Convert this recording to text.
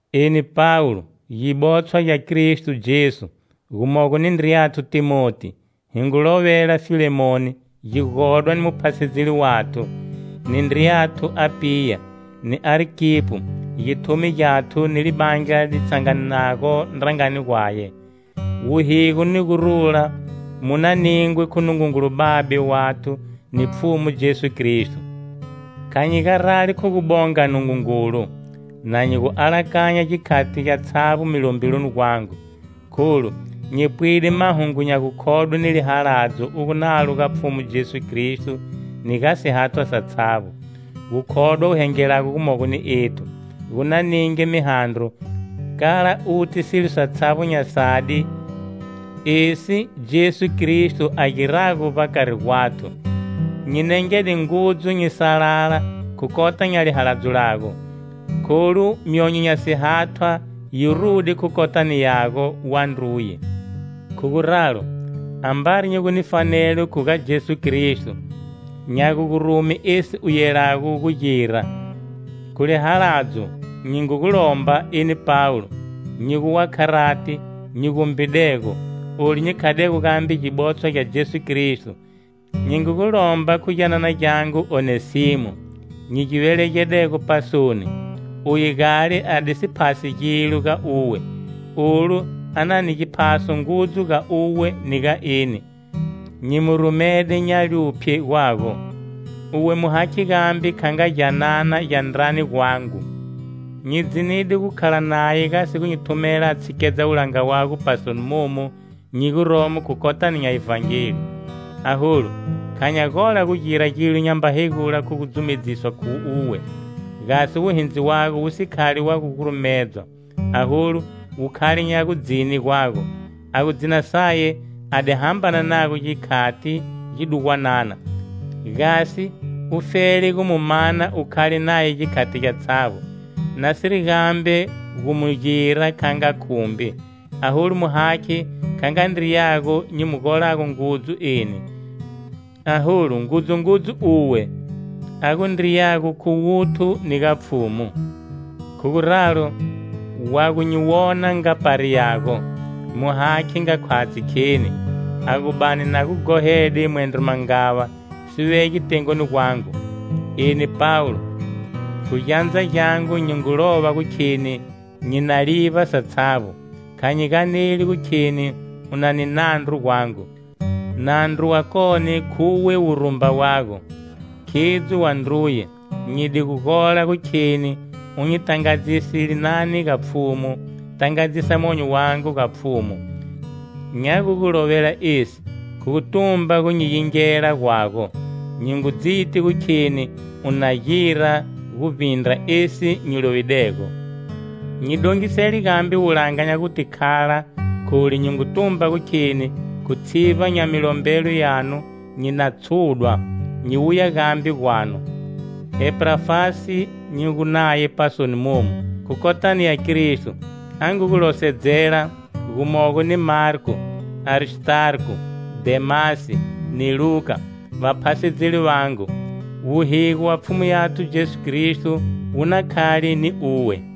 Eni Pawulo, gibotshwa gya KristoJesu, gumogo ni ndriyanthu Thimoti, hi ngu lovela Filemoni, gigodwa ni muphasedzeli wathu, ni ndriyathu Apiya, ni Arkipo, githumi gikwathu ni libandla li tshanganago ndrangani gwaye: Wuhigo ni gurula mu na ningwe khu Nungungulu Babe wathu ni Pfhumu Jesu Kristo. Kha nyi garali khu gu bonga Nungungulu, na nyi gu gu alakanya gikhati gyatshavbo milombeloni gwangu, Kholu, nyi pwide mahungu nya gukhodwe ni lihaladzo u gu nalo ga Pfhumu Jesu Kristo ni ga sihathwa satshavbo. Gukhodwa u hengelago gumogo ni ethu, gu na ninge mihandro, kala uti silo satshavbo nya sadi esi Jesu Kristo a girago vbakari gwathu. Nyi nengede ngudzu nyi salala khu kota nya lihaladzo lago, kholu myonyo nya sihathwa yi rude khu kotani yago, wandruye. Khu guralo, ambari nyi gu ni fanelo khu ga Jesu Kristo, nya gu gu rume esi u yelago gu gira, khu lihaladzo nyi ngu gu lomba, eni Pawulo, nyi gu wa kharati, nyi gumbidego, olu nyi khadego gambe gibotshwa gya Jesu Kristo. Nyi ngu gu lomba khu gyanana gyangu Onesimo, nyi gi velegedego pasoni. Uye gale a di si phasi gilo ga uwe, olu a na ni giphaso ngudzu ga uwe ni ga eni. Nyi mu rumede nya luphye gwago, uwe mu hakhe gambe kha nga gyanana gya ndrani gwangu. Nyi di dzinide gu khala naye gasi gu nyi thumela a tshikedza wulanga wago pasoni momu nyi guromo khu kotani nya Ivhangeli. Aholu, kha nya gola gu gira gilo nyamba hegula khu gu dzumedziswa khu uwe, gasi wuhindzi wago wu si khali wa gu gurumedzwa, aholu wu khale nya gudzine gwago. A gu dzina saye a di hambana nago gikhati gidugwanana, gasi ufele gu mu mana u khala naye gikhati gyatshavbo. Nasiri gambe gu mu gira kha nga khumbi, aholu mu hakhe kha nga ndriyago nyi mu golago ngudzu eni, aholu ngudzu ngudzu uwe, a gu ndriyago khu wuthu ni ga Pfhumu. Khu guralo, wa gu nyi wona nga pari yago, mu hakhe nga khwatshi kheni. A gu bani na gu ghohede mwendro mangava, si vege tengoni gwangu. Eni Pawulo, khu gyandza gyangu nyi ngu lova gu kheni nyi na livba satshavbo. Kha nyi ganeli gu kheni u na ni nandru gwangu, nandru wakone khuwe wurumba wago. Khidzo, wandruye, nyi di gu gola gu kheni u nyi tangadzise linani ga Pfhumu. Tangadzisa monyo wangu ga Pfhumu. Nya gu gu lovela esi khu gu tumba gu nyi yingela gwago; nyi ngu dziti gu kheni u na gira guvbindra esi nyi lovidego. Nyi dongisele gambe wulanga nya guta khala, kholu nyi ngu tumba gu kheni khu tshivba nya milombelo yanu nyi na tshudwa, nyi wuya gambe gwanu. Epafrasi nyi gu naye pasoni momu, khu kotani ya Kristo, a ngu gu losedzela, gumogo ni Marko, Aristarko, Dhemasi, ni Luka, vaphasedzeli vangu. Wuhigo wa Pfhumu yathu Jesu Kristo wu na khale ni uwe.